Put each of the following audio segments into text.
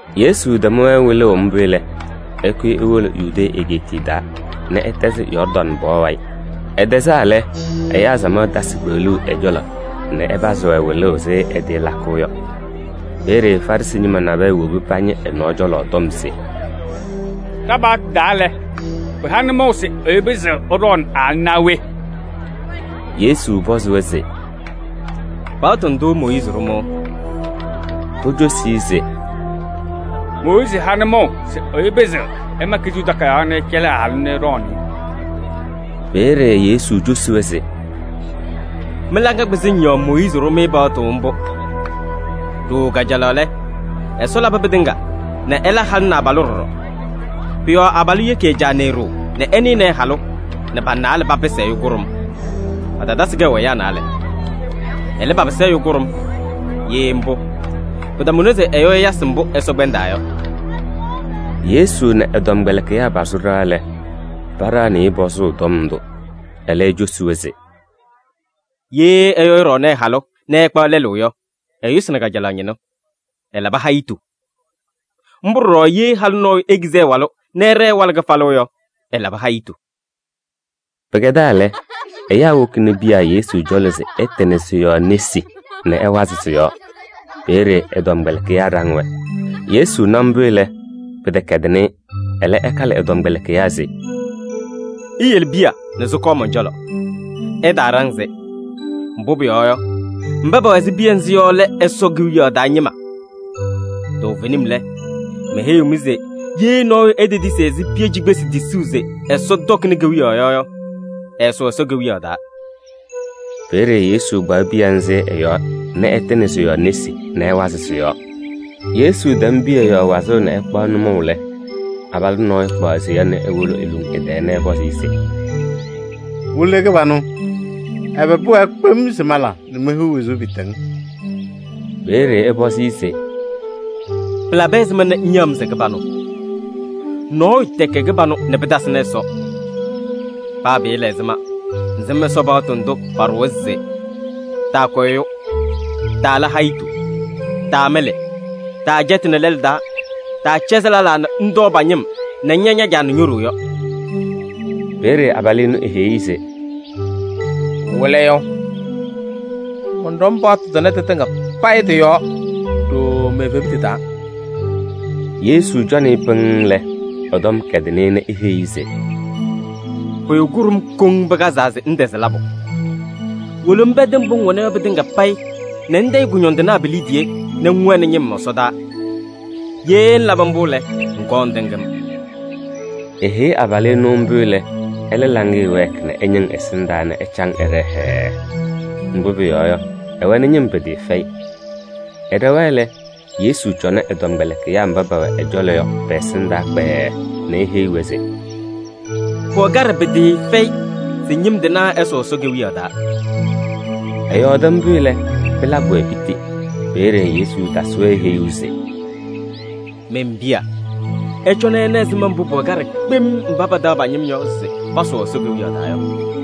Yesu tɛm-wɛ wɩlʋʋ mbʋ lɛ, ɛkʋyɩ ewolo Yudee egeetiye taa nɛ ɛtɛzɩ Yɔɔrdaŋ pɔɔ wayɩ. Ɛtɛzaa lɛ, ɛyaa samaɣ tasɩ kpeɣluu ɛ-cɔlɔ nɛ ɛpazɩ-wɛ wɩlʋʋ ɛzɩ ɛtɩɩlakʋʋ yɔ. Peeye Farɩsɩ ñɩma nabɛyɛ wobi pañɩ ɛ-nɔɔ cɔlɔ tɔm se: “Ɖa-paɣtʋ taa lɛ, pɩha nʋmɔʋ se ɛyʋ pɩzɩɣ ɛɖɔɔnɩ ɛ-halʋ naa we?” Yesu pɔzɩ-wɛ se: “Paɣtʋ ndʋ Mooyiizi ɖʋ-mɩ?” Pocosi-i se: “Mooyiizi ha nʋmɔʋ se ɛyʋ pɩzɩɣ ɛma kizuu takayaɣ nɛ ɛcɛlɩ ɛ-halʋ nɛ ɛɖɔɔnɩ-ɩ.” Peeye Yesu cosi-wɛ se: “Mɩ-laŋa kpɩzɩŋ yɔɔ Mooyiizi ɖʋ-mɩ paɣtʋ mbʋ. Ɖooo kajalaɣ lɛ, Ɛsɔ labɩ pɩtɩŋa nɛ ɛla halʋ nɛ abalʋ ɖɔɖɔ. Pʋ-yɔɔ abalʋ yeki ɛ-caa nɛ e-ɖoo nɛ ɛnɩnɩ ɛ-halʋ nɛ pa-naalɛ papɩsɩ ɛyʋ kʋɖʋm. Patatasɩ kɛʋ ɛyaa naalɛ. Ɛlɛ, papɩsɩ ɛyʋ kʋɖʋm. Ye mbʋ, pɩtamʋnɩ se ɛyʋ ɛyasɩ mbʋ Ɛsɔ kpɛndaa yɔ.” Yesu nɛ ɛ-tɔmkpɛlɩkɩyaa pasʋ ɖɩɣa lɛ, paɖaɣnɩ-ɩ pɔzʋʋ tɔm ndʋ. Ɛlɛ ecosi-wɛ se: “Ye ɛyʋ ɛɖɔɔnɩ ɛ-halʋ nɛ ɛkpaɣ lɛlʋ yɔ, ɛyʋsɩnɩ kajalaɣ ñɩnʋ, ɛlabɩ hayitu. Mbʋ ɖɔɖɔ ye halʋ nɔɔyʋ ekizi ɛ-walʋ nɛ ɛɖɛɛ ɛwalɩ kɩfalʋ yɔ, ɛlabɩ hayitu.” Pɩkɛdaa lɛ, ɛyaa wokini piya Yesu cɔlɔ se ɛtɩnɩ sɩ-yɔɔ nesi nɛ ɛwazɩ sɩ-yɔɔ. Peeye ɛ-tɔmkpɛlɩkɩyaa ɖaŋ-wɛ. Yesu na mbʋ lɛ, pɩtɛkɛdɩnɩ-ɩ, ɛlɛ ɛkalɩ ɛ-tɔmkpɛlɩkɩyaa se: “Iyele piya nɛ sɩkɔɔ mɔn-cɔlɔ, ɩtaaɖaŋ-sɩ. Mbʋ pʋyɔɔ yɔ, mba pɛwɛ ɛzɩ piya nzɩ yɔ lɛ Ɛsɔ Kewiyaɣ taa ñɩma. Toovenim lɛ, meheyiɣ-mɩ se ye nɔɔyʋ etetisi ɛzɩ piya cikpesi tisuu se Ɛsɔ tɔkɩnɩ kewiyaɣ yɔ yɔ, ɛɛsʋʋ Ɛsɔ Kewiyaɣ taa.” Peeye Yesu kpaɣ piya nzɩ ɛ-yɔɔ nɛ ɛtɩnɩ sɩ-yɔɔ nesi nɛ ɛwazɩ sɩ-yɔɔ. Yesu tɛm piya yɔɔ wazʋʋ nɛ ɛkpaɣ nʋmɔʋ lɛ, abalʋ nɔɔyʋ kpaɣ seya nɛ ewolo eluŋ ɛ-tɛɛ nɛ ɛpɔzɩ-ɩ se: “Wɩlɩyʋ kɩbanʋ! Ɛbɛ pʋwɛɛ kpem se mala nɛ mehiɣ wezuu pɩɩtɛŋ?” Peeye ɛpɔzɩ-ɩ se: “Pɩlabɩ ɛzɩma nɛ ŋyaɣ-m se kɩbanʋ? Nɔɔyʋ tɛkɛ kɩbanʋ nɛ pɩtasɩnɩ Ɛsɔ. Paa pɩɩla ɛzɩma, ŋsɩm Ɛsɔ paɣtʋ ndʋ paɖʋwa se: taakʋ ɛyʋ, taala hayitu, taamɩlɩ, taacɛtɩnɩ lɛlʋ taa, taacɛzɩ lɛlaa nɛ ŋtɔɔ pa-ñɩm nɛ ŋña ña-caa nɛ ño-ɖoo yɔ.” Peeye abalʋ ɛnʋ eheyi-i se: “Wɩlɩyʋ! Mɔnɖɔm paɣtʋ ndʋ tɩtɩŋa payɩ tɩ-yɔɔ ɖooo me-evebutu taa.” Yesu cɔnɩ-ɩ pɩŋŋ lɛ, ɛ-tɔm kɛdɩnɩ-ɩ nɛ eheyi-i se: “Pʋyʋ kʋɖʋm koŋ pɩkazaa se ŋtɛzɩ labʋ. Wolo ŋpɛdɩ mbʋ ŋwɛna yɔ pɩtɩŋa payɩ nɛ ŋtayɩ kʋñɔndɩnaa pi-liidiye nɛ ŋwɛnɩ ñɩm ɛsɔdaa. Ye ŋlabɩ mbʋ lɛ, ŋkɔɔ ŋtɩŋ-m.” Eheyi abalʋ ɛnʋ mbʋ lɛ, ɛlɛ laŋɩyɛ wɛɛkɩ nɛ ɛñɩŋ ɛsɩndaa nɛ ɛcaŋ ɛɖɛɛ hɛɛɛ. Mbʋ pʋyɔɔ yɔ, ɛwɛnɩ ñɩm pɩtɩɩfɛyɩ. Ɛɖɛwa lɛ, Yesu cɔnɩ ɛ-tɔmkpɛlɩkɩyaa mba pɛwɛ ɛ-cɔlɔ yɔ pɛ-ɛsɩndaa kpɛɛɛ nɛ eheyi-wɛ se: “Pʋwɛ kaɖɛ pɩtɩɩfɛyɩ se ñɩm tɩnaa ɛsʋʋ Ɛsɔ Kewiyaɣ taa.” Ɛyɔɔdɩ mbʋ lɛ, pɩlabɩ-wɛ piti. Peeye Yesu tasɩ-wɛ heyuu se: “Men-piya, ɩcɔnɩ ɩna ɛzɩma mbʋ pʋwɛ kaɖɛ kpem mba pataɣ pa-ñɩm yɔ se pasʋʋ Ɛsɔ Kewiyaɣ taa yɔ.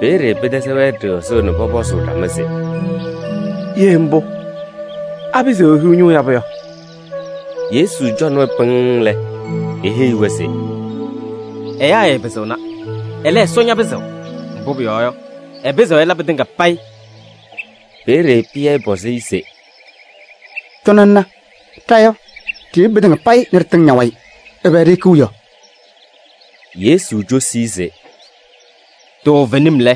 Peeye pɩtɛzɩ-wɛ ɖɩɣzʋʋ nɛ pɔpɔzʋʋ ɖama se: “Ye mbʋ, apɩzɩɣ ehiɣ ñʋʋ yabʋ yɔ?” Yesu cɔnɩ-wɛ pɩŋŋ lɛ, eheyi-wɛ se: “Ɛyaa ɛɛpɩzɩɣna, ɛlɛ, Ɛsɔ ñapɩzɩɣ, mbʋ pʋyɔɔ yɔ, ɛpɩzɩɣ ɛla pɩtɩŋa payɩ.” Peeye Pɩyɛ pɔzɩ-ɩ se: “Cɔnɩ ŋna, ɖa yɔ, ɖiyebi pɩtɩŋa payɩ nɛ ɖɩtɩŋ ña-wayɩ, ɛbɛ ɖihikiɣ yɔ?” Yesu cosi-i se: “Toovenim lɛ,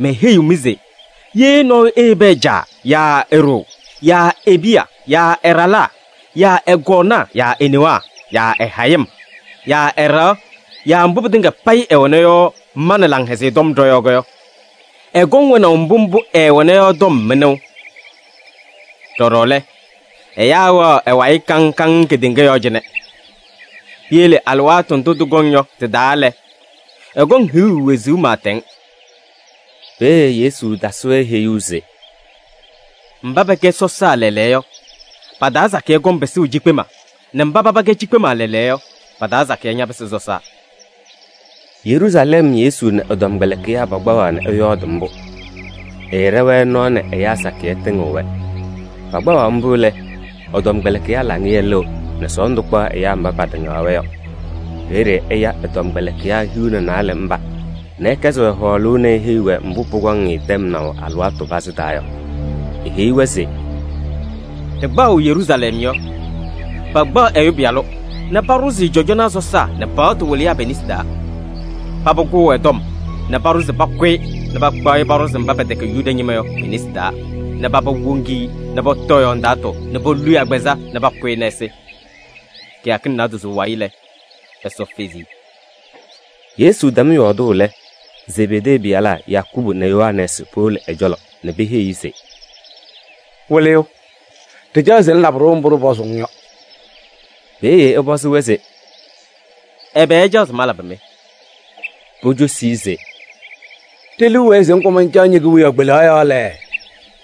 meheyiɣ-mɩ se ye nɔɔyʋ eyebi ɛ-caa yaa e-ɖoo yaa e-piya yaa ɛ-ɖalaa yaa ɛ-kɔɔnaa yaa e-newaa yaa ɛ-hayɩm yaa ɛ-ɖɩɣa yaa mbʋ pɩtɩŋa payɩ ɛwɛna yɔ ma nɛ Laŋhɛzɩyɛ Tɔm ɖɔ-yɔɔ yɔ, ɛkɔŋ wɛnaʋ mbʋ mbʋ ɛɛwɛna yɔ tɔm mɩnʋʋ. Ɖɔɖɔ lɛ, ɛyaa wɛɣ ɛ-wayɩ kaŋ kaŋ kedeŋa yɔɔ cɩnɛ. Piyele alɩwaatʋ ndʋ tɩkɔŋ yɔ tɩ-taa lɛ, ɛkɔŋ hiɣu wezuu pɩɩtɛŋ.” Peeye Yesu tasɩ-wɛ heyuu se: “Mba pɛkɛ sɔsaa lɛɛlɛɛyɔ yɔ, pa-taa sakɩyɛ kɔŋ pɩsʋʋ cikpema nɛ mba paba kɛ cikpema lɛɛlɛɛyɔ yɔ, pa-taa sakɩyɛ ñapɩsɩ sɔsaa.” Yeruusalɛm Yesu nɛ ɛ-tɔmkpɛlɩkɩyaa pakpaɣaɣ nɛ ɛyɔɔdʋʋ mbʋ. Ɛɛɖɛ-wɛ nɔɔ nɛ ɛyaa sakɩyɛ tɩŋɩɣ-wɛ. Pakpaɣaɣ mbʋ lɛ, ɛ-tɔmkpɛlɩkɩyaa laŋɩyɛ lɩɣ nɛ sɔɔndʋ kpaɣ ɛyaa mba patɩŋaɣ-wɛ yɔ. Peeye ɛya ɛ-tɔmkpɛlɩkɩyaa hiu nɛ naalɛ mba nɛ ɛkɛzɩ-wɛ hɔɔlʋʋ nɛ eheyi-wɛ mbʋ pʋkɔŋ-ɩ tɛmnaʋ alɩwaatʋ pazɩ taa yɔ. Eheyi-wɛ se: “Ɖɩkpaɣʋ Yeruusalɛm yɔ, pakpaɣ Ɛyʋ Pɩyalʋ nɛ paɖʋzɩ-ɩ cɔjɔnaa sɔsaa nɛ paɣtʋ wɩlɩyaa pe-nesi taa. Paba kʋʋ ɛ-tɔm nɛ paɖʋ se pakʋ-ɩ nɛ pakpaɣ-ɩ paɖʋzɩ mba pɛtɛkɛ Yuda ñɩma yɔ pe-nesi taa nɛ paba woŋ-i nɛ pɔtɔ ɛ-yɔɔ ndaatʋ nɛ polu-i agbazɛɛ nɛ pakʋ-ɩ nɛ ɛsɩ. Kɩyakɩŋ naadozo wayɩ lɛ, Ɛsɔ fezi-i.” Yesu tɛm yɔɔdʋʋ lɛ, Zebedee pɩyalaa Yakubu nɛ Yohanɛɛsɩ powolo ɛ-cɔlɔ nɛ peheyi-i se: “Wɩlɩyʋ, ɖɩcaɣ se ŋlabɩ-ɖʋ mbʋ ɖɩsʋlʋmʋʋ-ŋ yɔ.” Peeye ɛpɔzɩ-wɛ se: “Ɛbɛ ɩcaɣ se malabɩ-mɩ?” Pocosi-i se: “Ɖe-liu wɛɛ se ŋkɔm ŋcaɣ ñe-kewiyaɣ kpelaɣ yɔɔ lɛ,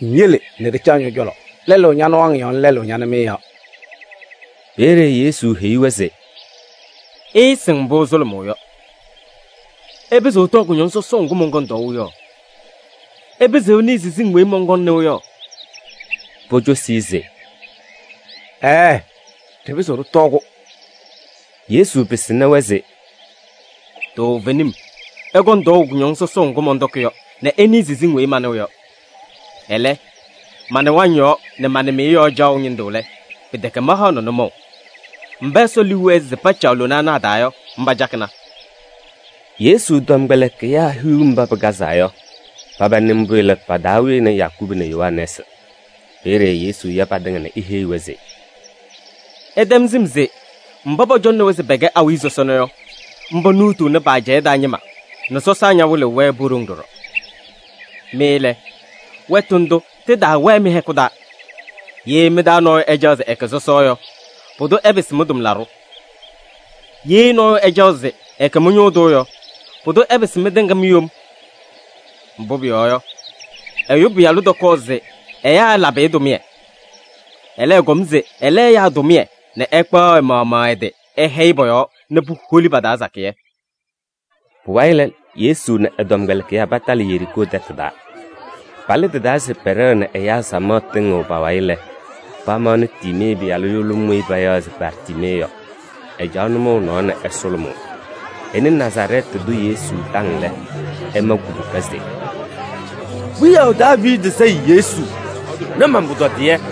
ŋyele nɛ ɖɩcaɣ ñɔ-cɔlɔ: lɛlʋ ña-nɩwaŋ yɔɔ nɛ lɛlʋ ña-nɩmɩyɛ yɔɔ.” Peeye Yesu heyi-wɛ se: “Ɩɩsɩŋ mbʋ ɩsʋlʋmʋʋ yɔ. Ɩpɩzɩɣ ɩtɔɔ kʋñɔŋ sɔsɔʋ ŋgʋ mɔnkɔŋ tɔɔʋ yɔ? Ɩpɩzɩɣ ɩnɩɩ siziŋ weyi mɔnkɔŋ nɩʋ yɔ?” Pocosi-i se: “Ɛɛɛ! Ɖɩpɩzɩɣ ɖɩtɔɔ-kʋ.” Yesu pɩsɩnɩ-wɛ se: “Toovenim ɩkɔŋ tɔɔʋ kʋñɔŋ sɔsɔʋ ŋgʋ mɔntɔkɩ yɔ nɛ ɩnɩɩ siziŋ weyi manɩɣ yɔ. Ɛlɛ, ma-nɩwaŋ yɔɔ nɛ ma-nɩmɩyɛ yɔɔ caɣʋ ñɩndʋ lɛ, pɩtɛkɛ mahaɣnɩ nʋmɔʋ. Mba Ɛsɔ liu wɛɛ se pacaɣ lona ana a-taa yɔ, mba cakɩna.” Yesu tɔmkpɛlɩkɩyaa hiu mba pɩkazaa yɔ, paba nɩ mbʋ lɛ, pa-taa wɩnɩ Yakubu nɛ Yohanɛɛsɩ. Peeye Yesu ya patɩŋa nɛ eheyi-wɛ se: “Ɩtɛm sɩm se mba pɔcɔŋnɩ-wɛ se pɛkɛ awiya sɔsɔna yɔ, mba nuutuuni pa-ajɛɛ taa ñɩma nɛ sɔsaa ñawɩlɩɣ-wɛ po-ɖoŋ ɖɔɖɔ. Mɩ lɛ, wɛtʋ ndʋ tɩtaawɛɛ mɩ-hɛkʋ taa. Ye mɩ-taa nɔɔyʋ ɛcaɣ se ɛkɛ sɔsɔ yɔ, pʋdʋ ɛpɩsɩ mɩ-tʋmlaɖʋ. Ye nɔɔyʋ ɛcaɣ se ɛkɛ mɩ-ñʋʋ tʋ yɔ, pʋdʋ ɛpɩsɩ mɩtɩŋa mi-yom. Mbʋ pʋyɔɔ yɔ, Ɛyʋ Pɩyalʋ tɔkɔɔ se ɛyaa ɛlabɩ-ɩ tʋmɩyɛ. Ɛlɛ, ɛkɔm se ɛla ɛyaa tʋmɩyɛ nɛ ɛkpaɣ ɛ-maɣmaɣ ɛ-tɩ ɛhɛyɩ pɔ-yɔɔ nɛ puholi pa-taa sakɩyɛ.” Pʋwayɩ lɛ, Yesu nɛ ɛ-tɔmkpɛlɩkɩyaa patalɩ Yeriikoo tɛtʋ taa. Palɩ tɩ-taa se pɛɖɛɣ nɛ ɛyaa samaɣ tɩŋɩɣ pa-wayɩ lɛ, pamaɣnɩ Tiimee pɩyalʋ yʋlʋm weyi payaɣ se Bartiimee yɔ. Ɛcaɣ nʋmɔʋ nɔɔ nɛ ɛsʋlʋmʋʋ. Ɛnɩ Nazarɛɛtɩ tʋ Yesu taŋ lɛ, ɛma kubuka se: “Wiyaʋ Daaviidi Sayɩ Yesu! Na man-pʋtɔdɩyɛ.”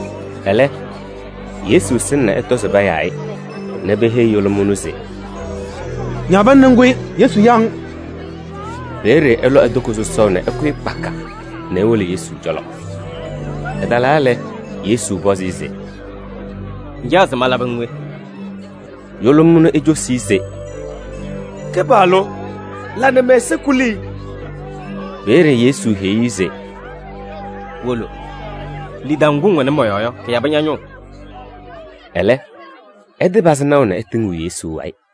Ɛlɛ, Yesu sɩŋ nɛ ɛtɔ se payaa-ɩ, nɛ peheyi yʋlʋm ɛnʋ se: “Ñaɣ pana ŋkʋyɩ, Yesu yaɣ-ŋ.” Peeye ɛlɔ e-toko sɔsɔʋ nɛ ɛkʋyɩ kpaka nɛ ewolo Yesu cɔlɔ. Ɛtalaa lɛ, Yesu pɔzɩ-ɩ se: “Ŋcaɣ se malabɩ-ŋ we?” Yʋlʋm ɛnʋ ecosi-i se: “Wɩlɩyʋ, mancaɣ se ŋla nɛ mɛ-ɛza kuli.” Peeye Yesu heyi-i se: “Wolo, lidaʋ ŋgʋ ŋwɛnɩ mɔ-yɔɔ yɔ, kɩyabɩ ña-ñʋʋ.” Ɛlɛ, ɛtɩpazɩ naʋ nɛ ɛtɩŋɩɣ Yesu wayɩ.